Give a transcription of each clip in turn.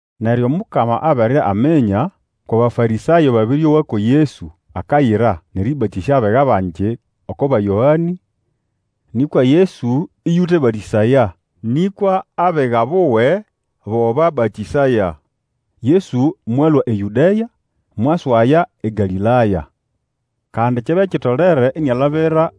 Neryo Omukama abere aminya kwʼAbafarĩsayo babĩrĩowa ko Yesu akayira nʼerĩbatĩsya abiga bangi oko ba Yoane, nĩkwa Yesu ĩyũtebatĩsaya, nĩkwa abiga buwe bo babatĩsaya. Yesu mwalũa eYũdea mwaswaya eGalĩlaya. Kandi kyabya kitolere inialabira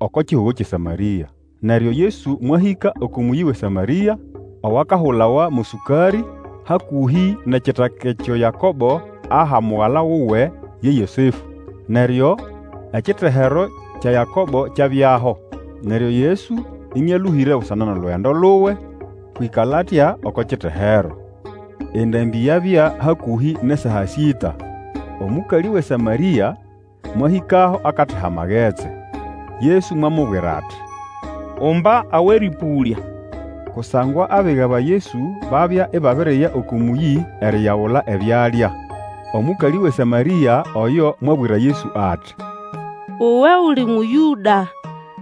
oko kihugo kyʼeSamarĩa. Neryo Yesu mwahĩka oko mũyĩ wʼeSamarĩa owakahulawa mo Sũkarĩ, hakũhĩ nʼekitaka ekyo Yakobo aha mugala wuwe ye Yosefũ. Neryo ekitehero kya Yakobo kyabyaho. Neryo Yesu, ĩnĩalũhĩre busana nʼolugendo luwe mwĩkala atya oko kitehero. Endambĩ yabya hakũhĩ na saa sĩta. Omũkalĩ wʼeSamarĩa mwahĩkaho akateha amagetsi. Yesu mwamubwira ati, Umba awʼerĩpũlya. Kusangwa abiga ba Yesu babya ibabiriya oko mũyĩ eriyagula ebyalya. Omũkalĩ wʼeSamarĩa oyo mwabwira Yesu ati, Uwe uli Mũyũda,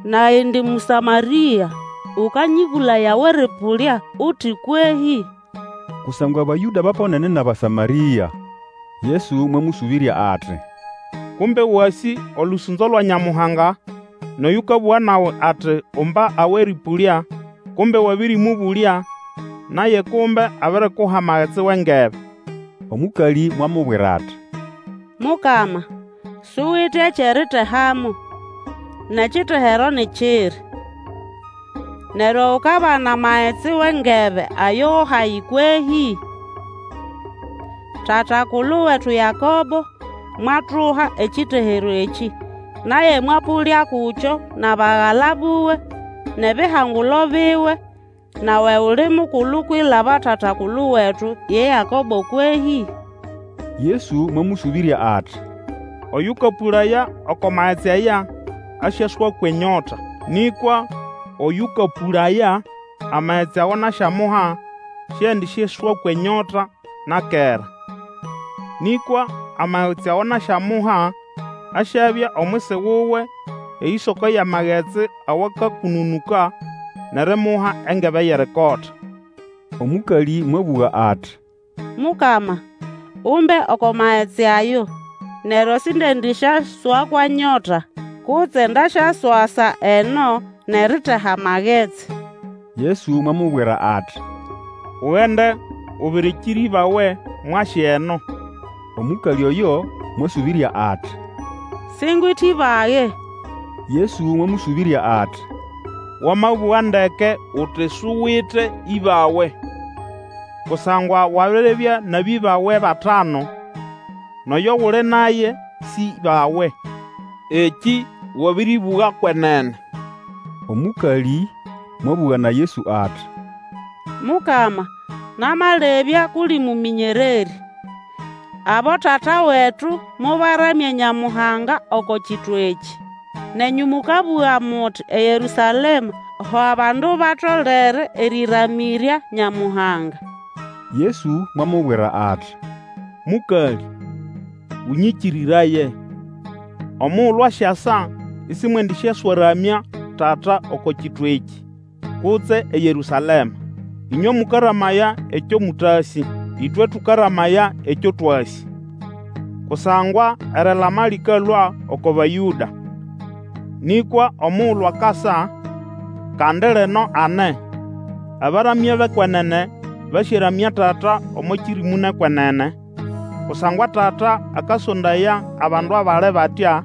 nage indi Mũsamarĩa, ũkanyĩbũlaya awʼerĩpũlya uti kwehĩ? Kusangwa Abayũda baponene nʼAbasamarĩa. Yesu mwamũsũbĩrya ati, Kumbe wasĩ olũsũnzo lwa Nyamuhanga, nʼoyũkabũga nawe ati, Umba awʼerĩpũlya, kumbe wabĩrĩmũbũlya, naye kumbe abirikuha amagetsi wʼengebe. Omũkalĩ mwamubwira ati, Mukama, suwite ekyʼeritehamo, nʼekitehero ni kiri. Neryo ukabana magetsi wʼengebe ayo go hahi kwehĩ? Tata-kulu wetu Yakobo, mwatuha, ekitehero ekĩ, naye mwapũlya kukyo nʼabagala buwe, nʼebihangulo biwe, nawe uli mukulu kwilaba tata-kulu wetu ye Yakobo kwehĩ? Yesu mwamũsũbĩrya ati, Oyũkapũlaya oko magetsi aya asyaswakwa enyota. Nĩkwa oyũkapũlaya amagetsi ago nasyamuha siendisyaswakwa enyota na kera. Nĩkwa amagetsi ago nasyamuka asyabya omwisi wuwe eyĩsoko yʼamagetsi awakakũnũnũka nʼerimuha engebe yʼerikota. Omũkalĩ mwabũga ati, Mukama, umbe oko magetsi ayo, neryo sindiendĩsyaswakwa nyota, kutse ndasyaswasa eno nʼeriteha magetsi! Yesu mwamubwira ati, Ugende, ubirikire ĩbawe, mwase eno. Omũkalĩ oyo mwasũbĩrya ati, Singwite ĩbage. Yesu mwamũsũbĩrya ati, Wamabũga ndeke uti suwite ĩbawe. Kusangwa wabiribya nʼabĩbawe batanu, nʼoyo guli naye sĩ ĩbawe. Ekĩ wabĩrĩbũga kwenene. Omũkalĩ mwabũga na Yesu ati, Mukama, namalebya kʼuli mũmĩnyererĩ. Abotata wetu mobaramya Nyamuhanga oko kitwa ekĩ, nenyũ mũkabũga muti eYerũsalema ho abandu batolere erĩramĩrya Nyamuhanga. Yesu mwamubwira ati, Mũkalĩ, ũnyĩkĩrĩraye, omugulu asyasa isimwendisyaswaramya Tata oko kitwa ekĩ, kutse eYerũsalema. Ĩnywe mũkaramaya ekyo mũtasĩ; ĩtwe tũkaramaya ekyo twasĩ, kusangwa erilama lĩkalũa oko Bayũda. Nĩkwa omugulu akasa, kandi lino ane, abaramya bʼekwenene basyaramya Tata omo kĩrĩmũ nʼekwenene, kusangwa Tata akasondaya abandu abali batya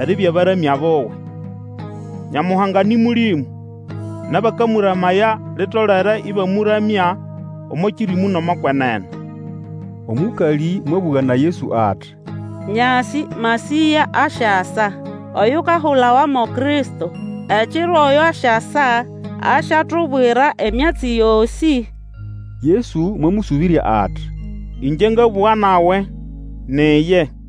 eribya baramya buwe. Nyamuhanga nĩ Mũlĩmũ, nʼabakamũramaya litolere ĩbamũramya omo kĩrĩmũ nʼomo kwenene. Omũkalĩ mwabũga na Yesu ati, Nyasĩ Masĩya asyasa, Oyukahulawa mo Kristo, ekiro oyo asyasa, asyatubwira emyatsi yosĩ. Yesu mwamũsũbĩrya ati, Ĩngye ngabũga nawe, ni iye.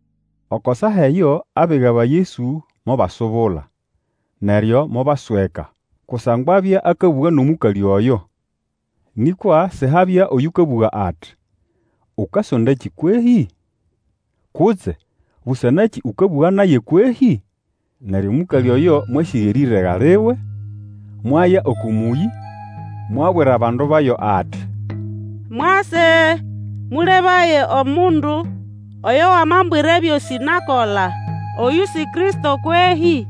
Oko saa eyo abiga ba Yesu mobasubula, neryo mobasweka kusangwa abya akabũga nʼomũkalĩ oyo. Nĩkwa sihabya oyũkabũga ati, Ukasondakĩ kwehĩ? Kutse, Busana nakĩ ũkabũga naye kwehĩ? Neryo omũkalĩ oyo mwasĩga erĩrega liwe, mwaya oko mũyĩ, mwabwira abandu bayo ati, Mwase, mũlebaye omundu, oyo wamambwira ebyosĩ nakola. Oyũ si Kristo kwehĩ?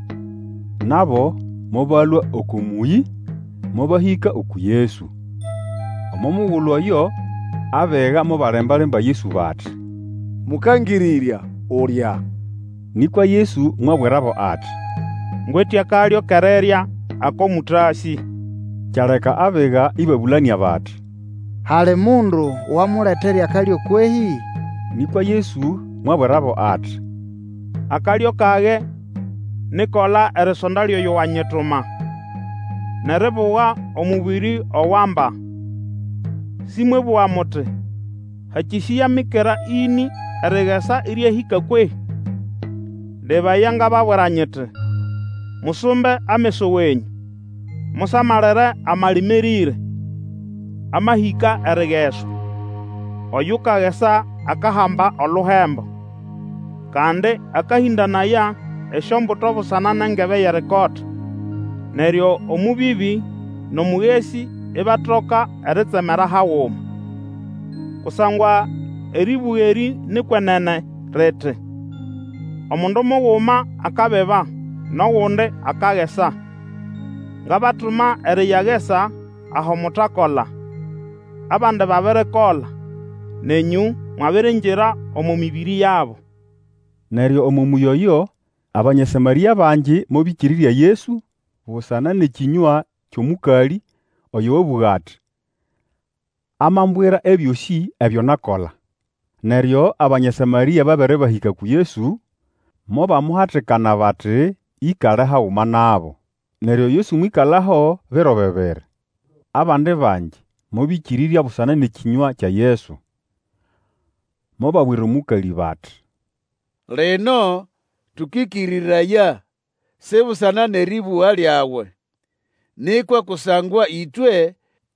Nabo mobalũa oko mũyĩ, mobahĩka uku Yesu. Omo mugulu oyo abiga mobalemba-lemba Yesu bati, Mũkangĩrĩrya, ulya! Nĩkwa Yesu mwabwirabo ati, Ngwite akalyo kʼerirya ako mũtasĩ. Kyaleka abiga ĩbabũlanĩa bati, Hali mundu wamuletere akalyo kwehĩ? Nĩkwa Yesu mwabwirabo ati, Akalyo kage ni ʼkola erisonda lyʼoyo wanyituma, nʼeribuga omũbĩrĩ ogo amba. Sĩmwebũga muti, Hakĩsĩya mikera ĩnĩ erigesa ĩryahĩka, kwehĩ? Lebaya, ngababwira nyiti, Musumbe ameso wenyũ, musamalire amalima erĩre, amahĩka erigeswa. Oyukagesa akahamba oluhembo. Kandi akahĩndanaya esyombuto busana nʼengebe yʼerikota, neryo omũbĩbĩ nʼomũgesĩ ibatoka eritsemera haguma. Kusangwa erĩbũga erĩ ni kwenene riti, Omundu muguma akabiba, nʼogundi akagesa. Ngabatuma eriyagesa aho mutakola; abandi babirikola, nenyũ mwabiriingira omo mĩbĩrĩ yabo. Neryo omo mũyĩ oyo, Abanya Samarĩa bangi mobĩkĩrĩrya Yesu busana nʼekĩnywa kyʼomũkalĩ oyo wabũga ati, Amambwira ebyosĩ ebyo nakola. Neryo Abanya Samarĩa babere bahĩka uku Yesu, mobamuhatikana bati ĩkale haguma nabo. Neryo Yesu mwĩkalaho biro bibiri. Abandi bangi mobĩkĩrĩrya busana ngʼekĩnywa kya Yesu. Mobabwira omũkalĩ bati, Lino tũkĩkĩrĩraya, si busana nʼerĩbũga lyawe, nĩkwa kusangwa ĩtwe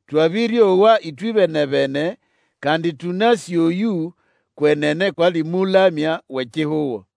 twabĩrĩowa ĩtwebene-bene, kandi tũnasĩ oyũ, kwenene kwʼali Mũlamya wʼekihugo.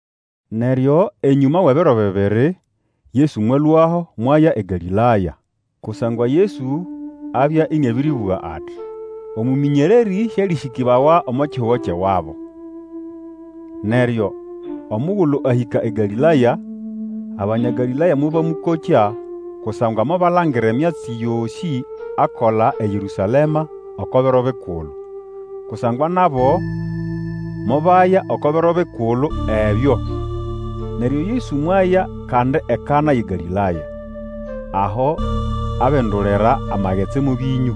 Neryo enyũma wʼebiro bibiri, Yesu mwalũaho mwaya eGalĩlaya. Kusangwa Yesu abya ĩnĩabĩrĩbũga ati, Omũmĩnyererĩ sĩalĩsĩkĩbawa omo kihugo kyʼewabo. Neryo omugulu ahĩka eGalĩlaya, Abanya Galĩlaya mobamũkokya kusangwa mobalangira emyatsi yosĩ akola eYerũsalema oko biro bikulu, kusangwa nabo mobaya oko biro bikulu ebyo. Neryo Yesu mwaya kandi eKana yʼeGalĩlaya, aho abindulira amagetsi mo bĩnyũ.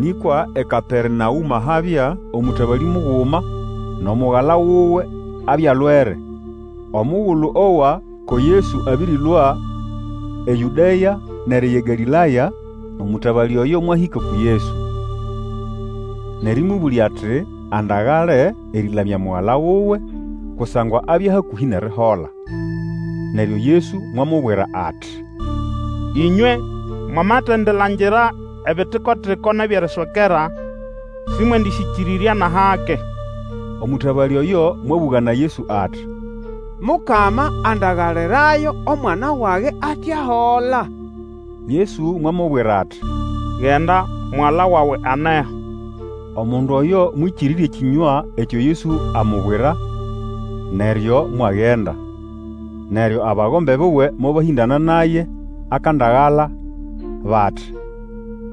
Nĩkwa eKapernaũma habya omũtabalĩ muguma, nʼomugala wuwe abya alwere. Omugulu owa ko Yesu abĩrĩlũa eYũdea nʼeriya eGalĩlaya, omũtabalĩ oyo mwahĩka uku Yesu, nʼerĩmũbũlya ati andagale erĩlamya mugala wuwe, kusangwa abya hakũhĩ nʼerihola. Neryo Yesu mwamubwira ati, Ĩnywe mwamatendilangira ebitiko-tiko nʼebyʼeriswekera, sĩmwendĩsyĩkĩrĩrya nʼahake. Omũtabalĩ oyo mwabũga na Yesu ati, Mukama, andagalirayo omwana wage ate ahola. Yesu mwamubwira ati, Genda, mugala wawe aneho. Omundu oyo mwĩkĩrĩrya ekĩnywa ekyo Yesu amubwira, neryo mwagenda. Neryo abagombe buwe mobahĩndana naye akandagala bati,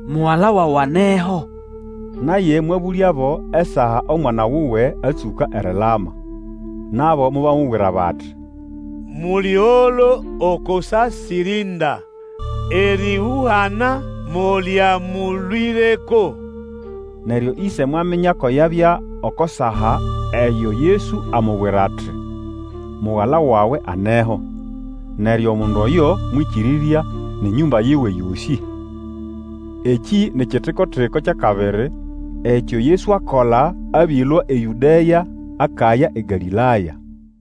Mugala wawe aneho. Naye mwabũlyabo esaa omwana wuwe atsũka erilama. Nabo mobamubwira bati, Mũlĩgolo oko saa sirinda erĩhũhana molyamũlũĩreko. Neryo ĩse mwaminya ko yabya oko saa eyo Yesu amubwira ati, Mugala wawe aneho. Neryo omundu oyo mwĩkĩrĩrya nʼenyũmba yiwe yosĩ. Ekĩ ni kitiko-tiko kyʼakabiri ekyo Yesu akola abĩlũa eYũdea akaya eGalĩlaya.